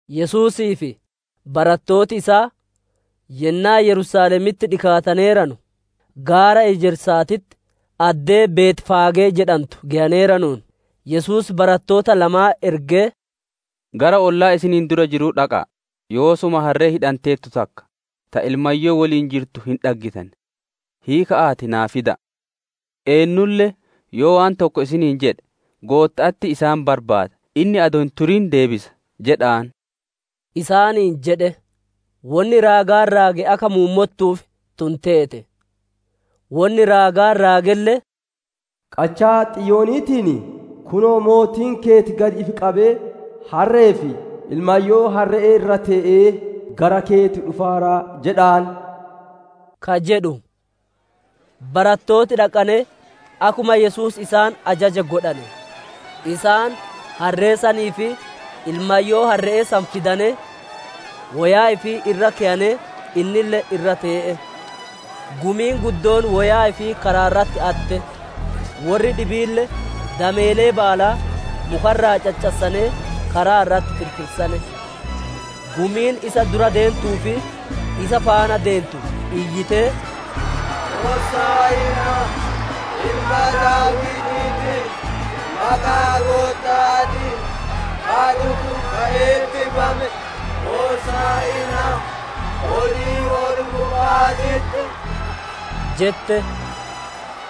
Yesuusii fi barattooti isaa yennaa Yerusaalemitti dhikaataneeranu, gaara Ejersaatitti, addee Betfaagee jedhantu geyaneeranuun, Yesuus barattoota lamaan ergee, «Gara ollaa isiniin dura jiruu dhaqa'a, yoosuma harree hidhanteertu takka, ta ilmayyoo woliin jirtu hin dhaggitan; hiika'aatii naa fida'a. Eennulle yoo waan tokko isiniin jedhe, ‹Gootta'atti isaan barbaada, inni adoo hin turin hin deebisa› jedha'aan» isaaniin jedhe. Wonni raagaan raage akka muummottuuf tun teete; wonni raagaan raagelle, «Qachaa Xiyooniitiin, ‹Kunoo, mootiin keeti gad ifi qabee, harre'ee fi ilmayyoo harre'ee irra tee'ee, gara keeti dhufaara› jedha'aan» ka jedhu. Barattooti dhaqanee akkuma Yesuus isaan ajaje godhane; Isaan harree sanii fi ilmayyoo harre'ee san fidane, woyaa ifii irra keyanee, innille irra tee'e. Gumiin guddoon woyaa ifii karaa irratti atte; worri dhibiille dameelee baalaa muka irraa caccassanee karaa irratti firfirsane. Gumiin isa dura deentuu fi isa faana deentu iyyitee, «Hosaa'inaa Ilma Daawitiitiif! Maqaa Gootta'aatiin ka dhufu ka eebbifame! Hosaa'inaa olii ol-gubba'aatitti!» jette.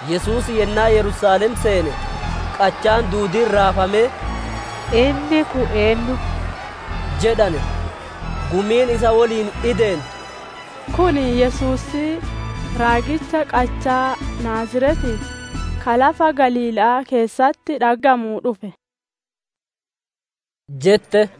Yesuus yennaa Yerusaalem seene, qachaan duudiin raafamee, «Inni kun eennu?» jedhane. Gumiin isa woliin ideentu, «Kun Yesuusii raagicha qachaa Naaziretii ka lafa Galiila'aa keessatti dhaggamuu dhufe» jette.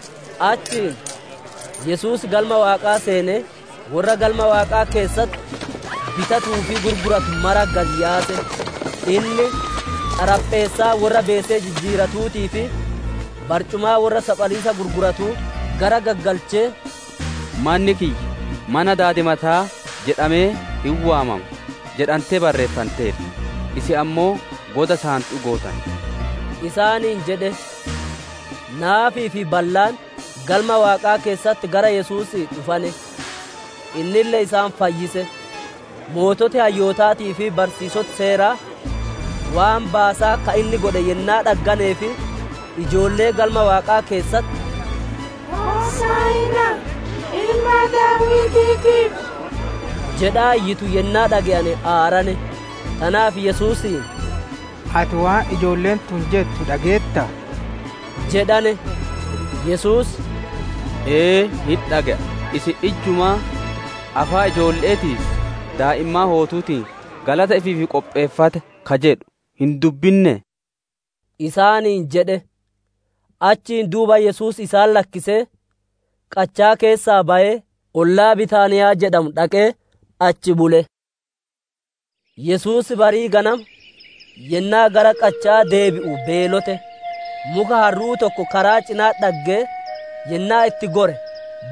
Achiin Yesuus Galma Waaqaa seenee, worra Galma Waaqaa keessatti bitatuu fi gurguratu mara gad yaase; inni xarapheessaa worra beesee jijjiiratuutii fi barcumaa worra saphaliisa gurguratuu garagaggalchee, «‹Manni kiyya mana daadimataa jedhamee hin waamama› jedhantee barreeffanteerti; isin ammoo goda saantu'uu gootane» isaaniin jedhe. Naafii fi ballaan Galma Waaqaa keessatti gara Yesuusii dhufane; innille isaan fayyise. Sooreyyiin hayyootaatii fi barsiisoti Seeraa waan baasaa ka inni godhe yennaa dhagganee fi ijoollee Galma Waaqaa keessatti, «Hosaa'inaa Ilma Daawitiitiif» jedhaa iyyitu yennaa dhaggane aarane. Tanaaf Yesuusiin, «Ati waan ijoolleen tun jettu dhageettaa?» jedhane. Yesuus, «Ee hin dhage'a; isin ijjumaa, ‹Afaan ijoolle'eetii fi daa'immaan hootuutiin galata ifiif qopheeffatte› ka jedhu hin dubbinnee?» isaaniin jedhe. Achiin duuba Yesuus isaan lakkisee, qachaa keessaa bayee, ollaa Bitaaniyaa jedhamuu dhaqee achi bule. Yesuus barii ganama, yennaa gara qacha'aa deebi'u beelote. Muka harru'uu tokko karaa cina'atti dhaggee, yennaa itti gore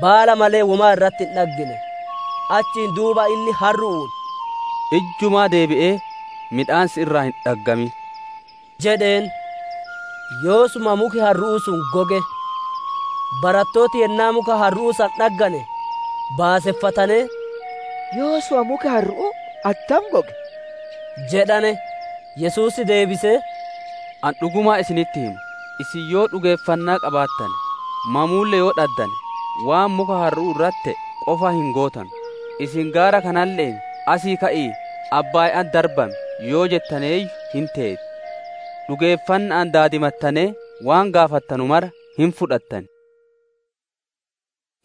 baala malee womaa irratti hin dhaggine. Achiin duuba inni harru'uun, «Ijjumaa deebi'ee midhaan si irraa hin dhaggamin» jedheen. Yoosuma muki harru'uu sun goge. Barattooti yennaa muka harru'uu san dhaggane, baaseffatanee, «Yoosuma muki harru'uu attam goge?» jedhane. Yesuus deebisee, «Ani dhuguma isinitti hima, isin yoo dhugeeffannaa qabaattane, mamuulle yoo dhaddane, waan muka harru'uu irratti te'e qofaa hin gootanu; isin gaara kanalle'een, ‹Asii ka'ii abbaaya'atti darbami› yoo jettanneeyyuu, hin teeti. Dhugeeffanna'aan daadimattanee waan gaafattanu mara, hin fudhattan»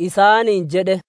isaaniin jedhe.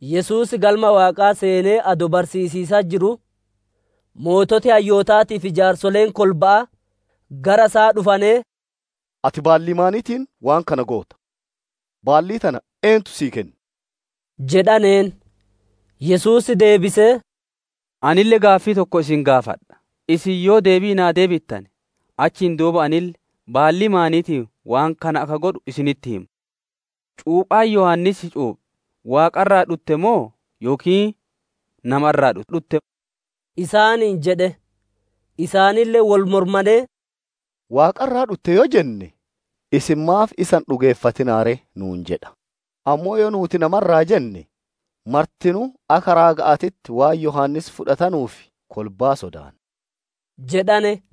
Yesuus yennaa Galma Waaqaa seenee adoo barsiisiisatti jiruu, sooreyyiin hayyootaatii fi jaarsoleen kolba'aa gara isaa dhufanee, «Ati baallii maaniitiin waan kana goota? Baallii tana eentu sii kenne?» jedhaneen. Yesuus deebisee, «Anille gaaffii tokko isin gaafadha; isin yoo deebii naa deebittane, achiin duuba anille baallii maaniitiin waan kana akka godhu isinitti hima. Cuuphaan Yohaannis cuuphe Waaqa irraa dhutte moo, yookiin nama irraa dhutte?» isaaniin jedhe. Isaanille wol mormanee, « ‹Waaqa irraa dhutte› yoo jenne, inni, ‹Isin maaf isa hin dhugeeffatinaa ree?› nuun jedha; Ammoo yoo nuuti, ‹Nama irraa› jenne, martinuu akka raaga'aatitti waan Yohaannis fudhatanuuf, kolbaa sodaanna» jedhane.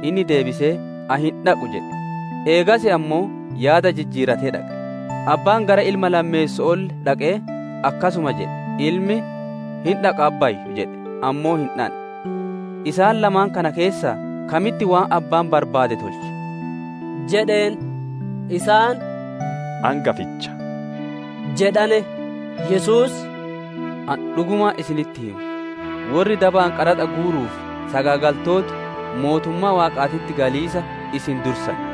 Inni deebisee, ‹Ani hin dhaqu› jedhe; eegas ammoo yaada jijjiiratee dhaqe. Abbaan gara ilma lammeesso'oolle dhaqee akkasuma jedhe; ilmi, ‹Hin dhaqa, abbayyoo!› jedhe; ammoo hin dhandhe. Isaan lamaan kana keessaa kamitti waan abbaan barbaade tolche?» jedheen. Isaan, «Angaficha» jedhane. Yesuus, «Ani dhugumaan isinitti hima, worri dabaan qaraxa guuruu fi sagaagaltooti mootummaa Waaqaatitti galiisa isin dursan.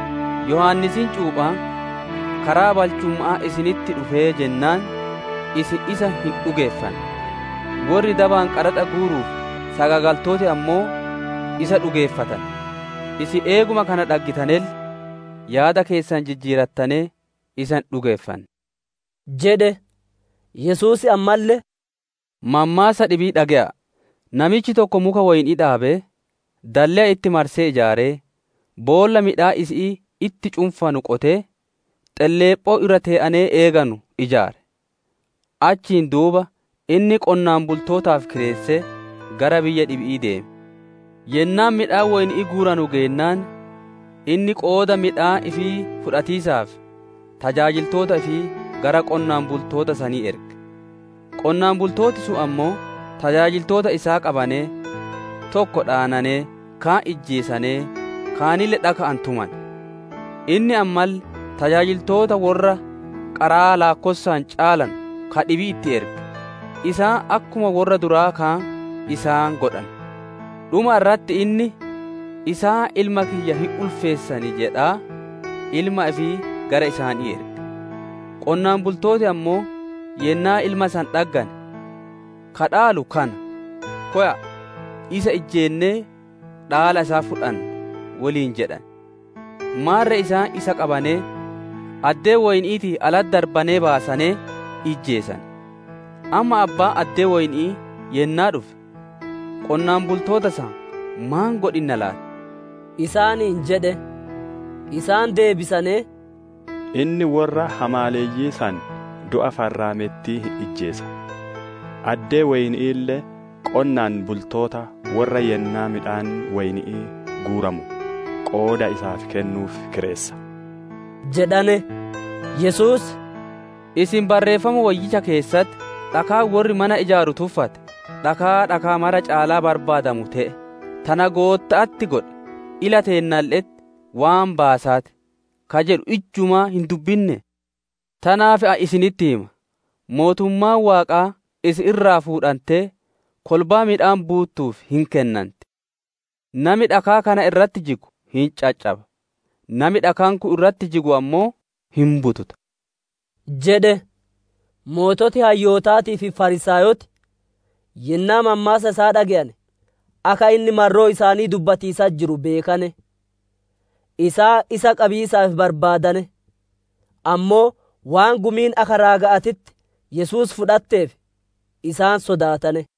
Yohaannisiin cuuphaan karaa balchumma'aa isinitti dhufee jennaan isin isa hin dhugeeffanne; worri dabaan qaraxa guuruu fi sagaagaltooti ammoo isa dhugeeffatane; isin eeguma kana dhaggitanelle, yaada keessan jijjiirattanee isa hin dhugeeffanne» isaaniin jedhe. Yesuus ammalle, «Mammaassa dhibii dhage'a'a! Namichi tokko muka woyni'ii dhaabee, dalleya itti marsee ijaaree, boolla midhaan isi'ii itti cunfu qotee, xelleephoo irra tee'anee eeganu ijaare. Achiin duuba inni qonnaan bultootaaf kireessee, gara biyya dhibi'ii deeme. Yennaan midhaan woyni'ii guuranu geennaan, inni qooda midhaan ifii fudhatiisaaf tajaajiltoota ifii gara qonnaan bultoota sanii erge. Qonnaan bultooti sun ammoo tajaajiltoota isaa qabanee, tokko dhaananee, kaan ijjeesanee, kaanille dhaka'aan tumane. Inni ammalle tajaajiltoota worra qaraa laakkossaan caalanu ka dhibii itti erge; isaan akkuma worra duraa kaan isaan godhane. Dhuma irratti inni, ‹Isaan ilma kiyya hin ulfeessan› jedhaa ilma ifii gara isaanii erge. Qonnaan bultooti ammoo yennaa ilma san dhaggane, ‹Ka dhaalu kana; kowa'a, isa ijjeennee dhaala isaa fudhannaa› woliin jedhane. Maarre isaan isa qabanee, addee woyni'iitii alatti darbanee baasanee ijjeesane. Amma abbaan addee woyni'ii yennaa dhufe, qonnaan bultoota san maan godhinna laati?» isaaniin jedhe. Isaan deebisanee, «Inni worra hamaaleyyii san du'a farraamettii hin ijjeesa. Addee woyni'iille qonnaan bultoota worra yennaa midhaan woyni'ii guuramu qooda isaaf kennuuf kireessa» jedhane. Yesuus, «Isin Barreeffama Woyyicha keessatti, «‹Dhakaan worri mana ijaaru tuffate, dhakaa dhakaa maraa caalaa barbaadamu te'e; tana Gootta'atti godhe, ila teennalle'etti waan baasaa ti!› ka jedhu ijjumaa hin dubbinnee? «Tanaaf, ani isinitti hima, mootummaan Waaqaa isin irraa fuudhantee kolbaa midhaan buuttuuf hin kennanti. [ Nami dhakaa kana irratti jigu hin caccaba; Nami dhakaan kun irratti jigu ammoo hin bututa» isaaniin jedhe.] Sooreyyii hayyootaatii fi Fariisaayoti yennaa mammaassa isaa dhage'ane, akka inni marroo isaanii dubbatiisatti jiru beekane. Isaan isa qabiisaaf barbaadane, ammoo waan gumiin akka raaga'aatitti Yesuus fudhatteef, isaan sodaatane.